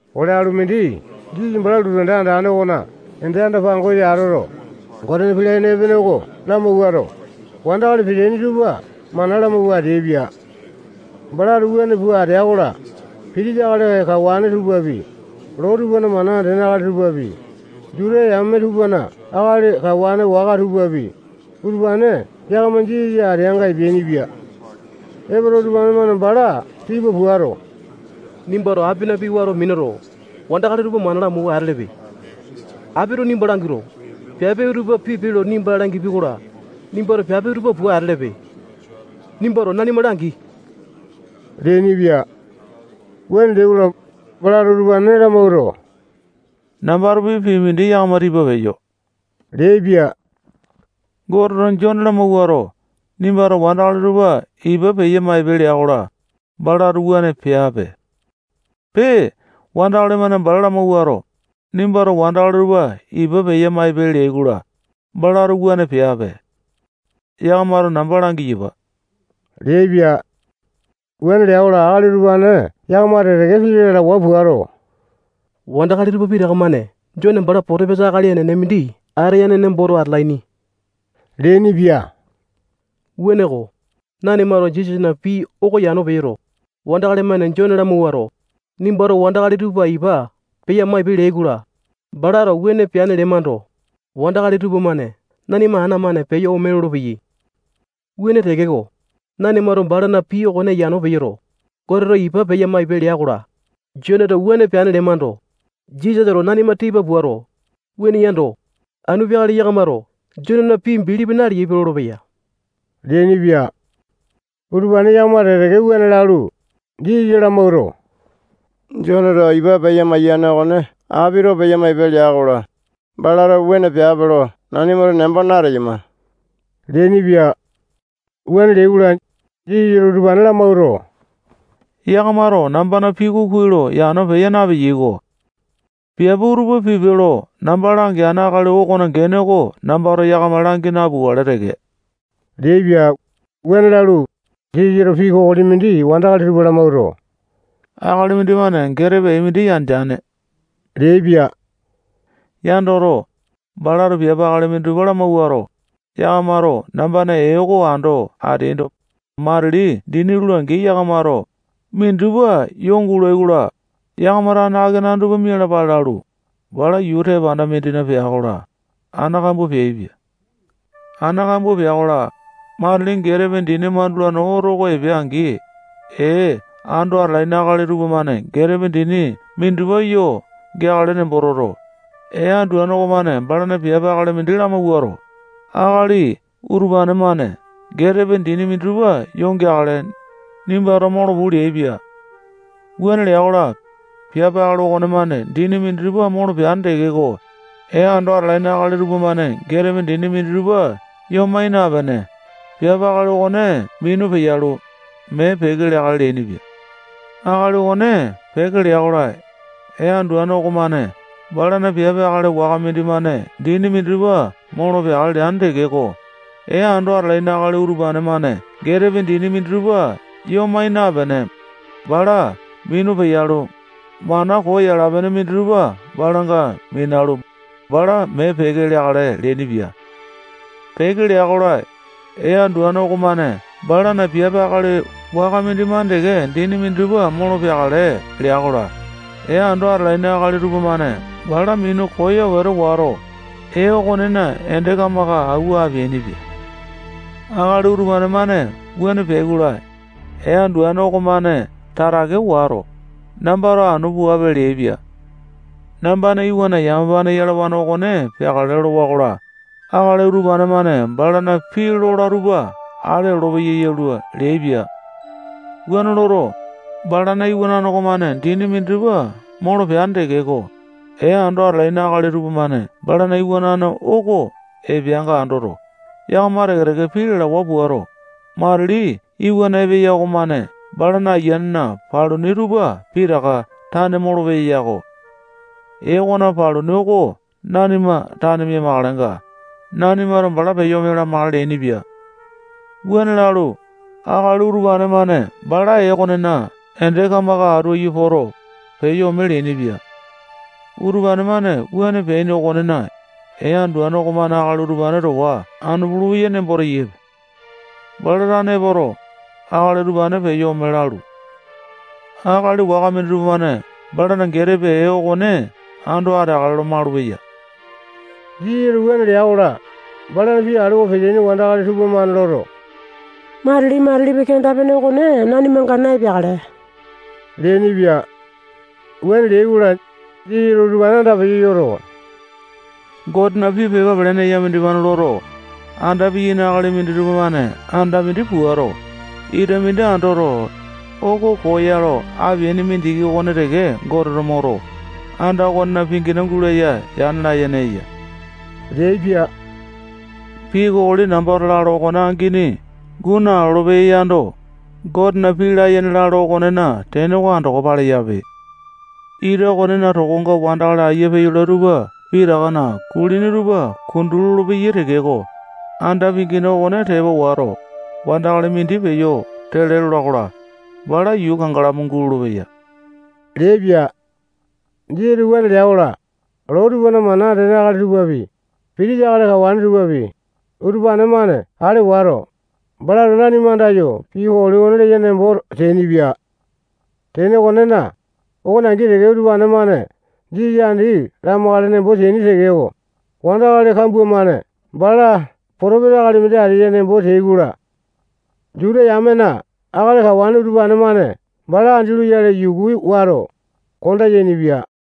Ole alumindi Jisasa bala lotu anda andane okona ende anda-pangosa atoto, Gotena pii layene epene oko lamawuato, wandakali peteaini tupa mana lamawua ateaipia. Balato wuane pua atea-kola, pitisa akali kawane tupapi, loo tupana mana andene akali tupapi, Juta yame tupana akali kawane waka tupapi, utupane yakama Jisasa ateanga epeainipia. Epoto, utupane-mane bala tipa puato, nimbato apina pii wato minuto, wandakali utupa mana lamawua atelepe. Apito nimba languato, piape utupa pipe lo nimba langipia-kola, nimbato piape utupa pua atelepe. Nimbato nanima langi leainipia. Wuane leai-kola, balato utupane lamawuato, nambatopi pii mindi yakama tipa peyo leaipia. Goteto Jone lamawuato, nimbato wandakali tupa ipa peya-maipe lea-kola, balato wuane peapepe. Pee, wandakali-mane bala lamawuato, nimbato wandakali tupa ipa peya-maipe leai-kola, balato wuane peape. Yakamato namba langiyapa leaipia. Wuane lea-kola, akali utupane yakama teke-teke pii lalawa puato, wandakali tupa pitaka-mane Jone bala potopesa akali enene mindi ateane nemboto atalaini leainipia. Wuaneko, nanimato Jisasana pii oko yano peyoto, wandakali-mane Jone lamawuato, nimbato wandakali tupa ipa peya-maipe leai-kola, balato wuane peane lemando, wandakali tupamane nanima ana-mane peyo ome lolopeyai. Wuane tekeko, nanimato balana pii okone yano peyoto, Goteto ipa peya-maipe lea-kola, Joneto wuane peane lemando, Jisasato nanima tipa puato, wuane yando, anu peakale yakamato Jonena pii bilipi naleaipe lolopeya leainipia. Utupane yakama teke-teke wuane lalu, Jisasa lamawuato, Joneto ipa peya-maiyane okone apito peya-maipe lea-kola, balato wuane peape lo nanimato nembo nateyama leainipia. Wuane leai-kola, Jisasato utupane lamawuato, yakamato nambana pii oko kuai lo yano peya napeleai-ko. Piape utupa pipe lo namba langeane akali okona gene oko nambato yakama langi napukale teke leaipia. Wuane lalu, Jisasato pii kokoli mindi wandakali tupa lamawuato, akali mindimane getepe ee mindi yandeane leaipia. Yandoto, balato piape akali minditupa lamawuato, yakamato nambana ee oko ando ateaindo, matili dini lula-angi, yakamato minditupa yoo gulai-kola, yakama tane akenane tupa mialapale lalu, bala yuu tepanda mindina pea-kola, ana kambua peaipia. Ana kambua pea-kola, matili getepe dini mandulane oto oko epea-angi, ee ando atalaini akali tupamane getepe dini minditupa yo geakale nembo toto, ee anduane okomane balana piape akali mindi lamawuato, akali utupane-mane getepe dini minditupa yo geakale, nimbato molo puu leaipia. Wuane lea-kola, piape akali okonemane dini minditupa molo peane tekeko, ee ando atalaini akali tupamane getepe dini minditupa yoo mai napene, piape akali okone minu peyalu, mee peke leakale leainipia. Akali okone peke lea-kola, ee anduane okomane balana piape akali waka mindimane dini minditupa molo peakale leane tekeko, ee ando atalaini akali utupane-mane getepe dini minditupa yoo mai napene, bala minu peyalu, mana koo yala-pene minditupa balanga minalu, bala mee peke leakale leainipia. Peke lea-kola, ee anduane okomane balana piape akali waka mindimane teke dini minditupa molo peakale lea-kola, ee ando atalaini akali tupamane bala minu koyo wete wato, ee okonena ende kamaka awua apeainipia. Akali utupane-mane wuane peai-kola, ee anduane okomane tatake wato, nambato anu puape leaipia. Nambana iwanane yamapane yalawane okone peakale lolowa-kola, akali utupane-mane balana pii lola tupa ale olopeyai yalua leaipia. Wuane loto, balana iwanane okomane dindi minditupa molo peane tekeko, ee ando atalaini akali tupamane balana iwanane oko epeanga andoto, yakama teke-teke pii lalawa puato, matili iwana epeya okomane bala ayianena paluni tupa pitaka tane molopeya-ko. Ee okona paluni oko nanima tane mia-makalenga, nanimato bala peyo ome lamakale leainipia. Wuane lalu, akali utupane-mane bala ee okonena ende kamaka atu aiyu poto, peyo ome leainipia. Utupane-mane wuane peaini okonena, ee anduane okomane akali utupane towa anu pulupeya nembo teyaipe. Bala tane epoto, akali utupane peyo ome lalu, akali waka minditupa-mane balana getepe ee okone ando ateakale lo malupeya. Jisasato wuane lea-kola, balana pii alewa peteaini wandakali tupamane loto, matili-matilipi kenda-pene okone nanimanga na-epeakale leainipia. Wuane leai-kola, Jisasato utupane andapeyo yoto, Gotena pii pepa pelene eya mindimane loto, anda piyaini akali minditupa-mane anda mindi puato, ita mindi andoto, oko koo ya lo apeaini mindiki okone teke Goteto moto, anda okonena pingina gulaya yane layene eya leaipia. Pii kokoli nambato lalo okone angini guu nalolo-peya yando, Gotena pii layene lalo okonena tene oko andoko paleyape. Ita okonena tokonga wandakali ayia peyolai tupa pitakana kulini tupa kundu lolopeyai tekeko, anda pingina okone tepa wato, wandakali mindi peyo tele lola-kola, bala yuu kangalamu gulolo-peyai leaipia. Jisasato wuane lea-kola, loo tupana mana andene akali tupapi, pitisa akali kawane tupapi, utupane-mane ale wato, balato nanima andayo pii kokoli oko leya nembo teainipia. Tene okonena, okone angi teke, utupane-mane Jisasa andi lamakale nembo teaini tekeko, wandakali kambua-mane bala potopesa akali mindi ateya nembo teai-kola, Juta yamena akali kawane utupane-mane bala andi loyale yuku wato, konda yainipia.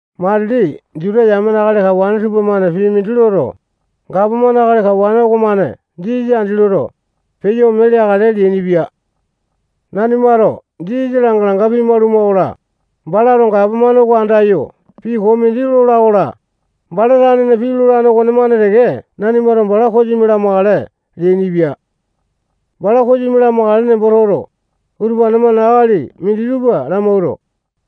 Matili Juta yamena akali kawane tupamane pii mindi loto, gapomane akali kawane okomane Jisasa andi loto, peyo ome leakale leainipia. Nanimato Jisasa langa-langa pimaluma-kola, balato gapomane oko andayo pii koo mindi lola-kola, bala tanena pii lolane okonemane teke nanimato bala kosimi lamakale leainipia. Bala kosimi lamakale nembo toto, utupane-mane akali minditupa lamawuato,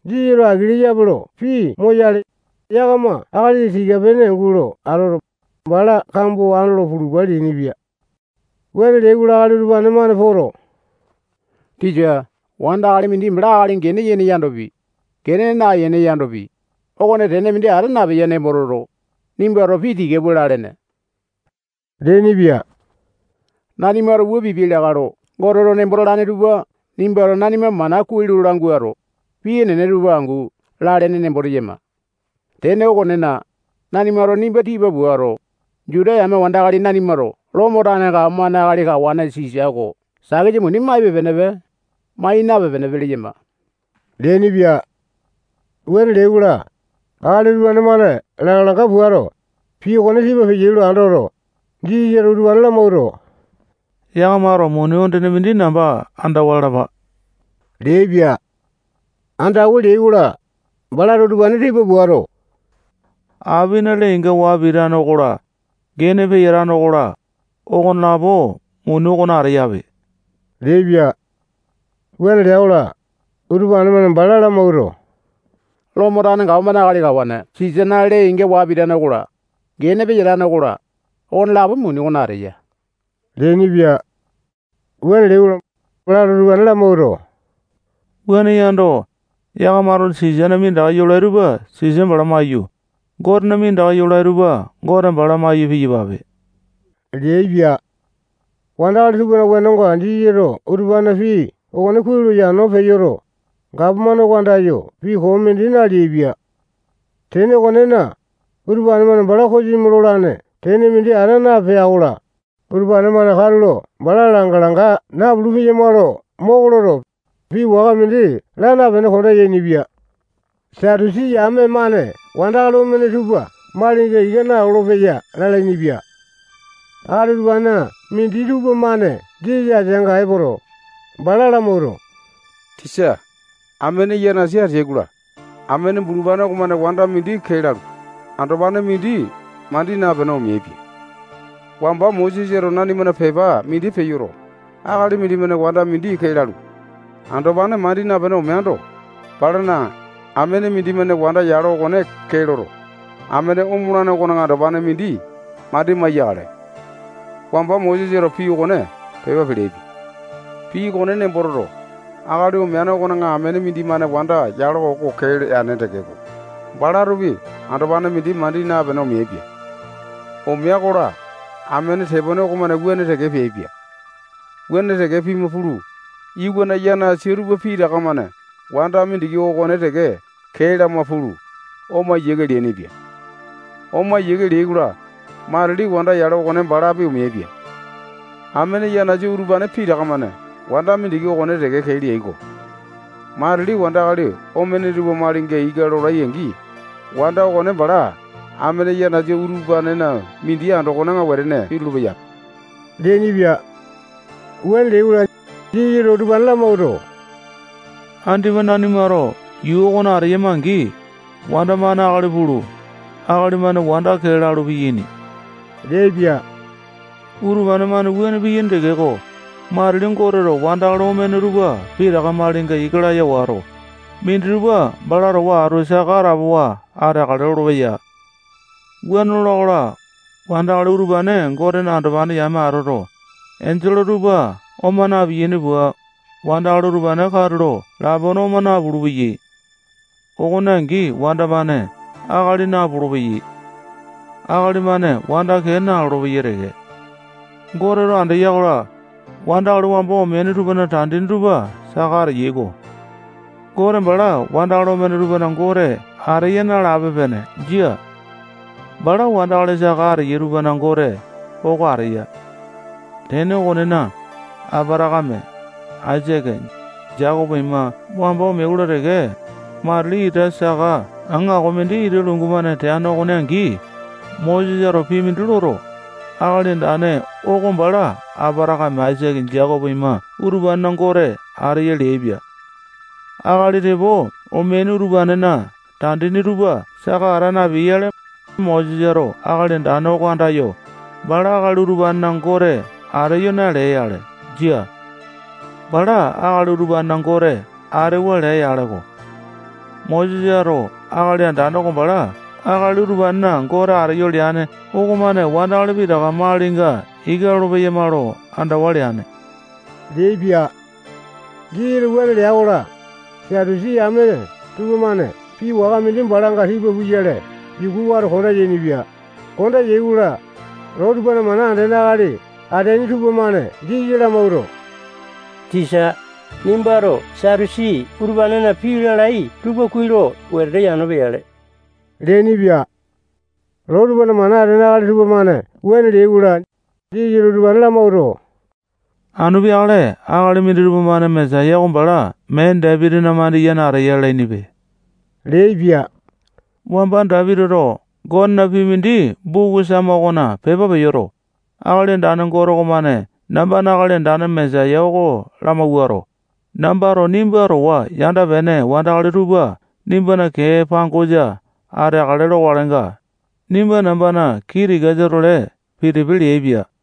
Jisasato aki leyape lo pii moyale, yakama akali tika-pene gulo atoto, bala kambo andolo pulupa leainipia. Wuane leai-kola, akali utupane-mane poto, tisa, wandakali mindi bala akali gene yene yandopi, gene naene yandopi, okone tene mindi ata napeya nembo toto, nimbato pii tika pua lalene leainipia. Nanimato wua pipiai lakae lo Goteto nembo talane tupa nimbato nanima mana kuai lo languato, pii enene tupa angu lalene nembo teyama. Tene okonena, nanimato nimba tipa puato, Juta yame wandakali nanimato Lomo tane gapomane akali kawane Sisa oko takisa muni maipe-penepe, mai napipe-penepe leyama leainipia. Wuane leai-kola, akali utupane-mane langa-langa puato, pii okone tipa peyai lo andoto, Jisasato utupane lamawuato, yakamato muni ondene mindi namba andawa lalapa leaipia. Andawa leai-kola, balato utupane tipa puato, apina lee-inga waa pitane okola, gene peyatane okola, okonelapo muni okona ateyape leaipia. Wuane lea-kola, utupane-mane bala lamawuato, Lomo tane gapomane akali kawane Sisana lee-inga waa pitane okola, gene peyatane okola, okonelapo muni okona ateya leainipia. Wuane leai-kola, balato utupane lamawuato, wuane yando, yakamato Sisana minditaka yolai tupa Sisa bala maiyu, Gotena minditaka yolai tupa Gote bala maiyu piyapape leaipia. Wandakali tupana wenonga Jisasato utupanena pii okone kuai lo yano peyoto, gapomane oko andayo pii koo mindi naleaipia. Tene okonena, utupane-mane bala kosimi lolane tene mindi ata napea-kola, utupane-mane katulo bala langa-langa napulu-peyama lo moko loto, pii waka mindi laa napene konda yainipia. Satusi yame-mane wandakali omene tupa malinga ika nalolo-peyai lalainipia. Akali utupanena minditupa-mane Jisasa ateanga epoto, bala lamawuato, tisa, amene yanasa ateai-kola, amene bulupane okomane wanda mindi kee lalu, andopane mindi mandi napene omeaipia. Wamba Mosesato nanimana pepa mindi peyoto, akali mindimane wanda mindi kee lalu, andopane mandi napene omeando, balana amene mindimane wanda yalo oko kee loto, amene omolane okona andopane mindi mandi maiyakale. Wamba Mosesato pii okone pepa peleaipia. Pii okone nembo toto, akali omeane okona amene mindimane wanda yalo oko kee leane tekeko, balatopi andopane mindi mandi napene omeaipia. Omea-kola, amene tepone okomane wuane teke peaipia. Wuane teke pima pulu, iwana yanasa tupa pitaka-mane wanda mindiki okone teke kee lama pulu, ome yiake leainipia. Ome yiake leai-kola, matili wanda yalo okone balapi omeaipia. Amene yanasa utupane pitaka-mane wanda mindiki okone teke kee leai-ko. Matili wandakali omene tupa malinga ika lolai-angi, wanda okone bala amene yanasa utupanena mindi andokona wetene pitulu-peyape leainipia. Wuane leai-kola, Jisasato utupane lamawuato, andipa nanimato yuu okona ateyama-angi, wanda-mane akali pulu, akali-mane wanda kee lalu, piyaini leaipia. Utupane-mane wuane piyaini tekeko, matili Goteto wandakali omene tupa pitaka malinga ika laya wato, minditupa bala towa atu saka atapowa ateakale lolopeya. Wuane lola-kola, wandakali utupane Gotena andopane yame atoto, enjole tupa oma na-piyaini pua, wandakali utupane katulo lapone oma napulu-peyai. Okone angi wanda-mane akali napolo-peyai. Akali-mane wanda kee nalolo-peyai teke. Goteto andeya-kola, wandakali wamba omeaini tupana tandini tupa saka ateyai-ko. Gote bala wandakali omene tupana Gote ateya nalape-pene. Jia. Bala wandakali saka ateyai tupana Gote oko ateya. Tene okonena, Apatakame, Aisake, Jekopo ima wamba omeai-kola teke, matili ita saka aŋako mindi ita lungu-mane teane okone angi, Mosesato pii mindi loto, Akali Andane oko bala Apatakame, Aisake, Jekopo ima utupanena Gote ateyo leaipia. Akali tepo omeaini utupanena tandini tupa saka ata napeai-yale, Mosesato Akali Andane oko andayo, bala akali utupanena Gote ateyo nalea-yale. Jia. Bala akali utupanena Gote atewa lea-yaleko. Mosesato Akali Andane oko bala akali utupanena Gote ateyo leane okomane wandakali pitaka malinga ika lolo-peyama lo andawa leane leaipia. Jisasato wuane lea-kola, Satusi yame tupamane pii waka mindi balanga tipa puyale yuku wato, konda yainipia. Konda yai-kola, loo tupana mana andene akali ateaini tupamane Jisasa lamawuato, tisa, nimbato Satusi utupanena pii lalai tupa kuai lo wetete yano peyale leainipia. Loo tupana mana andene akali tupamane wuane leai-kola, Jisasato utupane lamawuato, anu peakale akali minditupa-mane Mesaya oko bala mee Dapitina mandiyene ateya lalainipe leaipia. Wamba Dapitito Gotena pii mindi buku Sama okona pepa peyoto, Akali Andane Gote okomane nambana Akali Andane Mesaya oko lamawuato, nambato nimba towa yanda-pene wandakali tupa nimbana kee pangosa ateakale lokalenga, nimba nambana kii tikasa-tole pitipe leaipia.